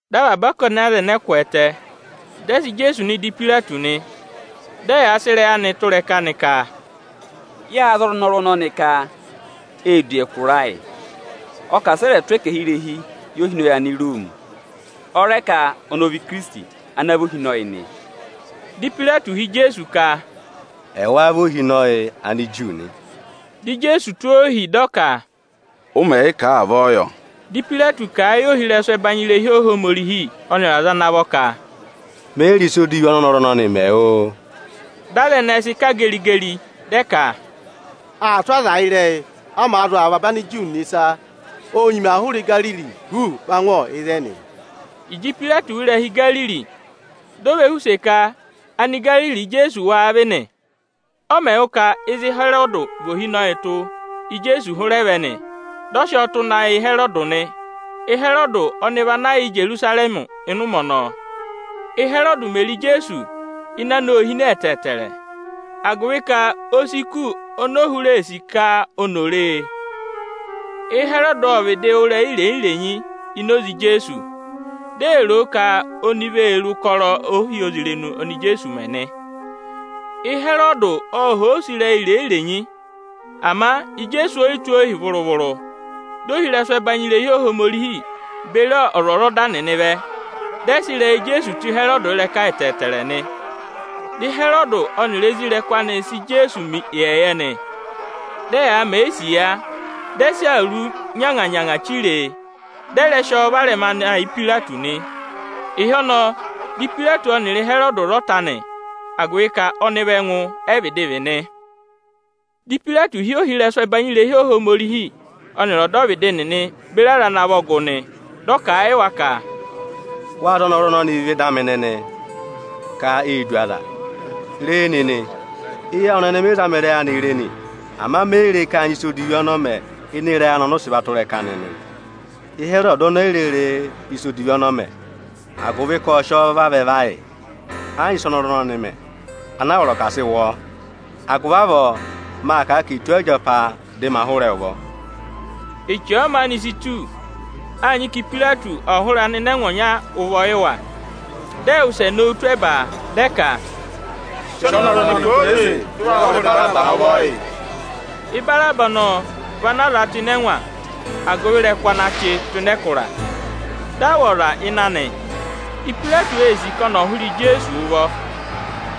Dị avaba ọkọnị aza ẹnẹẹ kwẹẹtẹ, dị ẹ sị Ijeesu nọ ịdị Ipayireti nị. Dị ẹyaa sị ịrẹyị anịị tụ́ ịrẹka nị ka, “Yâ za ọnọrụ ọnọnị ka ee du ẹkụra ayị; ọ ka asị ẹ rẹ̀ tụ́ ẹkẹhị irehi yị ohinọyị Aniroomi. Ọ rẹ ka ọnị ọ vị Ikirisiti ana vị ohinọyị nị.” Dị Ipayireti họ̀ Ijeesu ka, “Ẹ wáá vị ohinọyị Aniju nị?” Dị Ijeesu tụ́ ọọ ohi, dị ọ ka, “Ụ mẹ̀ yị kà a, avọọ yọ.” Dị Ipayireti kà a yị ohirẹsụ ẹbanyị irehi Ohomorihi ọnịrị aza ana vọ ka, “Me yi re ịsa odivi ọnị ọnọrụ ọnọnị mẹ, oo!” Dị aza ẹnẹẹ sị kà geri-geri, dị ẹ ka, “Aa tụ́ aza ịrẹyị, ọ màa zụ̀ avaba Aniju nịnị ịsa; ô nyima hụrẹ Igariri huuu va ngụ ịzẹnị.” Ịjị Ipayireti wụ́ ịrẹha Igariri, di o ve họ̀ use ka Anigariri Íjeesu wáá vị nị. Ọ mẹ̀ wụ́ ka ịzị Ịhẹrọdị vị ohinọyị tụ́, Íjeesu hụrẹ vẹ nị, dị ọ sị ọọ tụ́ na yị Ịhẹrọdị nị. Ịhẹrọdị ọnị vị ana yà Ijerusarẹmị ịnị ụmẹ ọnọọ. Ị́hẹrọọdụ mè re Ijeesu, ịnẹ anị ô hine ẹtẹẹtẹrẹ, agụvị ka o si kù oni o hụrẹ ee sì ka oni ò ree. Ịhẹrọdị ộ vịdị wụ́ ịrẹyị irenyi-irenyi ini oze Ijeesu, di ee ro o ka oni vee re ụkọrọ ohyozirenu oni Ijeesuū mẹ nị. Ịhẹrọdị ộ họ̀ ọ use ịrẹyị irenyi-renyi, ama Ijeesu o yi tụ́ o ohi vụrụ-vụrụ. Di ohirẹsụ ẹbanyị irehi Ohomorihi beri ọzwọzọda nịnị vẹ, dị ẹ sị ịrẹyị Ijeesu tụ́ Ịhẹrọdị ịrẹka ẹtẹẹtẹrẹ nị. Dị Ịhẹrọdị ọnịrị isoja anị nịnị aa sị Ijeesu mẹ ịyẹyẹ nị. Dị ẹyaa mẹ̀ ẹ isiya, dị ẹ sị awuru nyanga-nyanga chire e, dị ẹ rẹ sị ọọ varẹma na yị Ipayireti nị. Ịhị ọnọọ dị Ipayireti ọnịrị Ịhẹrọdị sị vara ọta nị; agụvị ka ọnịvị ẹngụ ẹ vịdị vị nị. Dị Ipayireti hị́ ohirẹsụ ẹbanyị irehi Ohomorihi ọnịrị ọdọvịdị nịnị beri aza ana vọ gụ nị. Dị ọ kà a yị wa ka, “Wâ za ọnọrụ ọnọnị vẹ ịdị amị nịnị ka ee du aza. Re nịnị, eyi awụ nịnị mị zama ịrẹyị anị re nị, ama me yi re ka â nyị ịsa odivi ọnị ọ mẹ ịnị ịrẹyị anị ọnị ụ sị va tụ́ ịrẹka nịnị. Ịhẹrọdị oni e yi re re ịsa odivi ọnị ọ mẹ, agụvị ka ộ sị ọ vavẹ va yị. Ẹ yị nyị ịsị ọnọrụ ọnọnị mẹ, ana a vọrọ ka à sị wụ ọọ. Agụvị avọọ, maa kà a ka è tụ́ ọ ịjapa, dị ma hụrẹ ẹ ụvọ.” [Eche ọ̀ọ maanị si tù, â nyị ka Ipayireti ọ̀ hụrẹ anịnẹngwa ọnya ụvọ.] Dị ẹ wụsẹ nowu tụ́ ẹba, dị ẹ ka, “Sị ọnọrụ ọnọnị kwooze, dị ụ wa hụrẹ Ibaraba ụvọ yị.” Ibaraba ọnọọ vị ana a za tụ́ ịnị ẹngwa agụvị ịrẹkụ ana chị tụ́ ịnị ẹkụra, dị a wụ̀ ọza ịnị anị. Ipayireti ee sì ka ọnị ọ̀ hụrẹ Ijeesu ụvọ,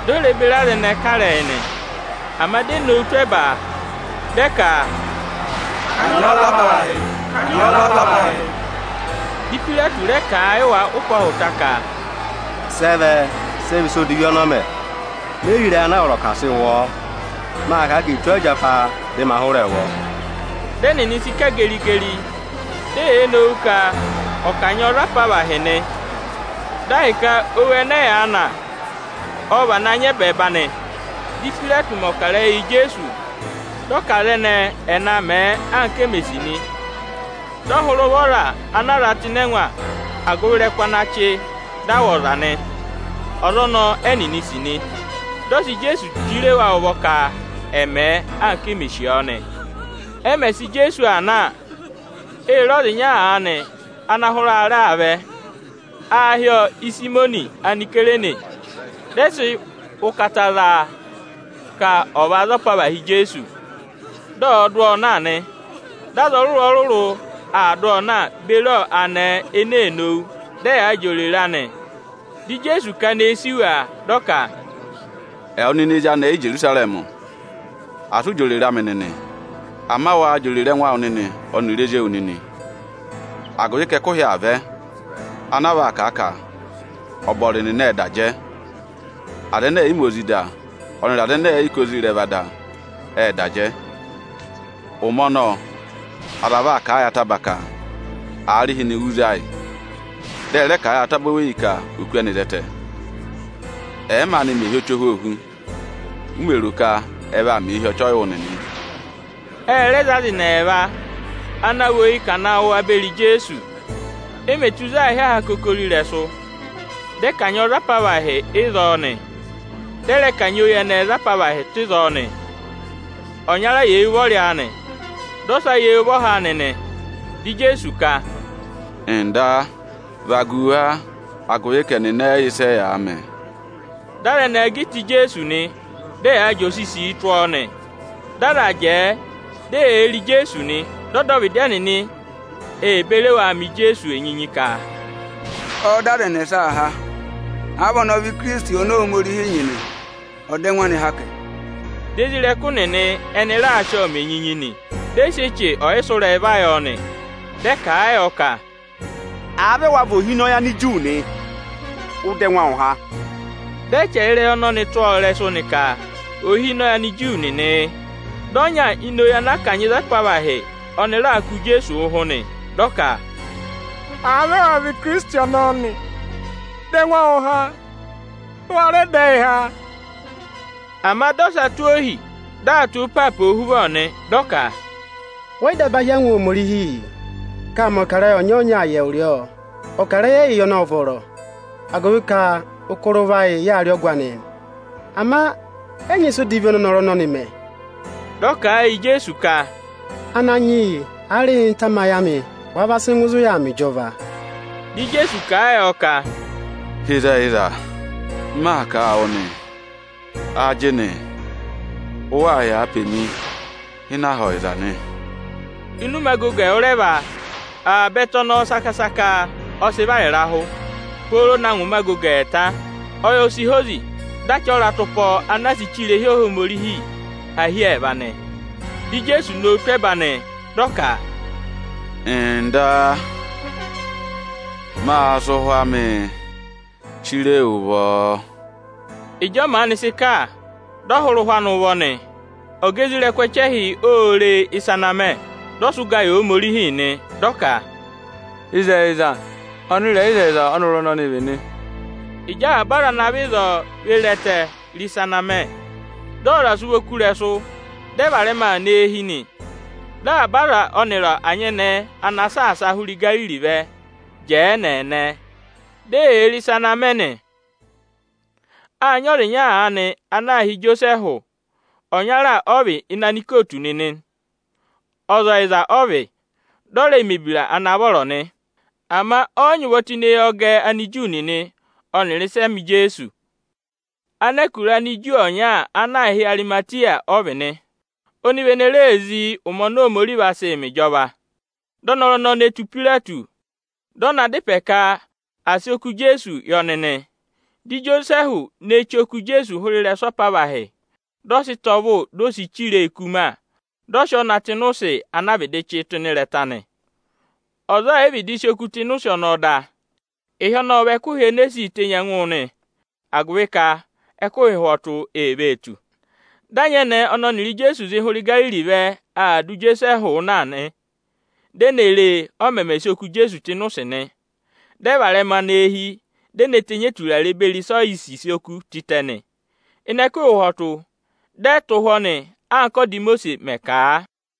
di o re beri aza ẹnẹẹ kà ịrẹyị nị. Ama di e nowu tụ́ ẹba, dị ẹ ka, “Kanyị ọ za apavahị! Kanyị ọ za apavahị!” Dị Ipayireti rẹ kà a yị wa ụpẹ ọhụta ka, “Sị ẹ vẹ, sị ẹ vị ịsa odivi ọnị ọ mẹ? Me yi re ịrẹyị ana a vọrọ ka à sị wụ ọ. Maa kà a ka è tụ́ ọọ ịjapa, dị ma hụrẹ ẹ ụvọ.” Dị ẹnịnị sị kà geri-geri, di eyee nowu ka ọ̀ kanyị ọọ za apavahị nị. Dị ahịka owu ẹnẹ ẹyaa na, ọ vana nyị ẹbẹẹba nị. Dị Ipayireti mẹ̀ ọkarẹyị yị Ijeesu, dị ọ ka aza ẹnẹẹ ẹ̀ na mẹ̀ ẹ, anka e mè sì nị. Dị ọ hụrẹ ụvọ ọza ana a za tụ́ ịnị ẹngwa agụvị ịrẹkụ ana chị dị a wụ̀ ọza nị. Ọza ọnọọ ẹ́nịnị sì nị. Dị ọ sị Ijeesu chire wa ụvọ ka ẹ̀ mẹ̀ ẹ, anka e mè sì ọọ nị. Ẹ mẹ̀ sị Ijeesu aa na, ê re ọza ịnya aanị ana hụrẹ aarẹ aa vẹ. Aā hị́ ọọ Ịsayịmọnị Anisayireni. Dị ẹ sị ụkata za a, ka ọ̀ va za apavahị Ijeesu, dị ọ̀ọ dụ ọọ na nị. Dị aza ọrụrụ-ọrụrụ aa dụ ọọ na beri anẹẹ ene ee nowu, dị ẹyaa jị oreree yọ nị. Dị Ijeesu kana eyi sì wa, dị ọ ka, “Ẹwụ nịnị ezi anẹẹ Ijerusarẹmị, asị ụ jị òrèrè amị nịnị! Ama waa jị òrèrè ẹngụ awụ nịnị ọnịrị ezi ewu nịnị! Agụvị ka ẹkụhị aa vẹ, ana a vaa kà a ka: ‘Ọbọrị nịnị ệ da jẹ. Aza ẹnẹ ẹ̀ yị ma ozi da, ọnịrị aza ẹnẹ ẹ̀ yị kà ozi ịrẹva da, ệ da jẹ.’ Ụmẹ ọnọọ, aza vaa kà a yị ataba ka: ‘Aarịhịnị, wú za yị! dị ẹ rẹ kà a yị ataba oweyi ka ọ̀ và kú ẹnị za ẹtẹ’ Ẹ̀ẹ maanị mẹ hi ọchị ohwoohu, u mè ro ka ẹ vaa mẹ ọchị ọyịwụ nịnị?” Ẹ rẹ za aza ẹnị ẹẹva ana vị oyi ka à na wụ̀ wa beri Ijeesu. E mè tù ịzị aā hị́ aha akokoro ịrẹsụ, dị ẹ kanyị ọọ za apavahị ịzọọ nị. Dị ẹ rẹ kanyị oyi ẹnẹẹ za apavahị tụ́ ịzọọ nị; ọnyara yà eyi ụvọrị anị, dị ọsa yà eyi ụvọha anị nị. Dị Ijeesu ka, “Nda, vagu wa, agụvị ka ẹnịnị ẹ yị yẹ ịsị ẹyaa mẹ!” Dị aza ẹnẹẹ gà ịta Ijeesu nị, dị ẹyaa jị osisii tụ́ ọọ nị. Dị aza jẹẹ, di eyee re Ijeesu nị. Dị ọdọvịdị ẹnịnị ê beri wa mẹ Ijeesu isiya ka, “Ọọ̄ dọ aza ẹnẹsaa há; àa vị ọnị ọ vị Ikirisiti ọnọọ oni Ohomorihi nyị nị, ọ̀ dọ ẹngụ anị há kẹ!” Dị isoja nịnị ẹnị raa sị ọọ mẹ enyinyi nị. Dị ẹ sị eche ọsụrẹyị va yọ nị. Ệ kà a yọ ka, “Àa vị ẹwa vị ohinọyị Aniju nị, ụ dọ ẹngụ awụ há!” Dị ẹ chẹrẹ ịrẹyị ọnọnị tụ́ akẹbẹẹba nị ka, “Ohinọyị Aniju nịnị yị”. Dị ọnya ini oyi ana a kanyị za apavahị, ọnị raa kụ̀ Ijeesu ụhụ nị. Dị ọ ka, “Àa vị ẹwa vị Ikirisiti ọnọọ nị, dọ ẹngụ awụ há, dị ụ wa rẹ dọ ẹ yị há!” Ama dị ọsa tụ́ ohi, dị aa tụ́ ịịpaapa ohuvọ nị. Dị ọ ka, “Wẹ yị daba hí angwa Ohomorihi, ka â mẹ̀ ọkarẹyị ọnyọọnya yị ẹwụrị ọọ? Ọkarẹyị ẹyị ọnị ộ vọrọ, agụvị ka ụkọrọ ụvọ ayị, ị yaa rị ọgụ anị nị. Ama ẹ yị nyị ịsa odivi ọnị ọnọrụ ọnọnị mẹ.” Dị ọ kà a yị Ijeesu ka, “Ananyị yị, aarịhịnị tamayị amị, wàa va sị ngụ ịzị ụ yà aa mẹ ịjọva!” Dị Ijeesu kà a yọ ka, “Ịzẹyịza m maa kà a wụ nị, ajịnị ụ waa yà pe mi ịnị Aha Ọyịza nị.” Ịnị ụmẹ agogo ẹwụrẹva, avaba ẹtẹ ọnọọ saka-saka ọ sị vara ịrahụ, pooro na ngụ ụmẹ agogo ẹẹta. Ọyị o si hozi, dị achị ọratụpọ ana a sị che irehi Ohomorihi, há hi ẹẹva nị. Dị Ijeesu nowu tụ́ ẹba, dị ọ ka, “Nda, mâ sị ụhwẹ amị chire wu ụvọ.” Ịjị ọ maanị sị kà, dị ọ hụrẹ ụhwẹ anị ụvọ nị. Ọga isoja ẹchẹhị nịnị ô re ịsa ana mẹ, dị ọ sị ụga yị Ohomorihi nị, dị ọ ka, “Ịzẹyịza, ọnịrẹyịzẹyịza ọ́nọrụ ọnọnị vị nị.” Ịjị avaba aza ana vẹ ịzọọ ve re ẹtẹ, re ịsa ana mẹ, dị ọzọza sị ụvọ kú ịrẹsụ, dị ẹ varẹma aa nọ eehi nị. Dị avaba aza anị ọnịrị anyẹnẹẹ ana saasa a hụrẹ Igariri vẹ, jẹẹ ẹnẹẹnẹ, di eyee re ịsa ana aa mẹ nị. Â nyị ọza ịnya aanị ana aā hị́ Ijosẹẹhụ, ọnyara ọ vị ịnị anikootu nịnị nị. Ọza ọyịza ọ vị, dị ọ rẹẹ̄ mẹ̀ ebira ana vọrọ nị. Ama ọ yị nyị ụvọ tụ́ ịnị ẹyọgẹ Aniju nịnị ọnịrị ịsị ẹ mẹ Ijeesu. Anẹkụra Aniju ọnya ana aā hị́ Arịmatịya ọ vị nị. Ọnị vị ene ree zí ụmẹ oni Ohomorihi vaa sị mẹ ịjọva. Dị ọnọrụ ọnọọ ne tù Ipayireti, dị ọ na dá ịpẹ ka à sị oku Ijeesu yị ọnị nị. Dị Ijosẹẹhụ ne chí oku Ijeesu hụụ ịrẹsụ apavahị, dị ọ sị ịta ọvụ, di o si chire e ikuma, dị ọ sị ọọ na tụ́ ịnị ụsị ana a vịdị chị tụ́ ịnị ịrẹta nị. Ọza ọọ̀ yị vịdị sị oku tụ́ ịnị ụsị ọnọọ da. Ịhị ọnọọ ọ vị ẹkụhị ene e sii tenyi ẹngụ nị, agụvị ka ẹkụhị ụhwọtụ ee vee tù. Dị anyẹnẹẹ ẹnẹ ẹnịrị Ijeesu zị hụrẹ Igariri vẹ, dụ Ijosẹẹhụ na, di e ne re, ọ mẹmẹ sị oku Ijeesu tụ́ ịnị ụsị nị. Dị ẹ varẹma nọ eehi, di e ne tenyi eturare beri ịsa oyisisi oku tịtẹ nị. Ịnị ẹkụhị ụhwọtụ, dị ẹ tụ́ ụhwọ́ nị, anka ọ́da Imosiisi mẹ̀ kà a.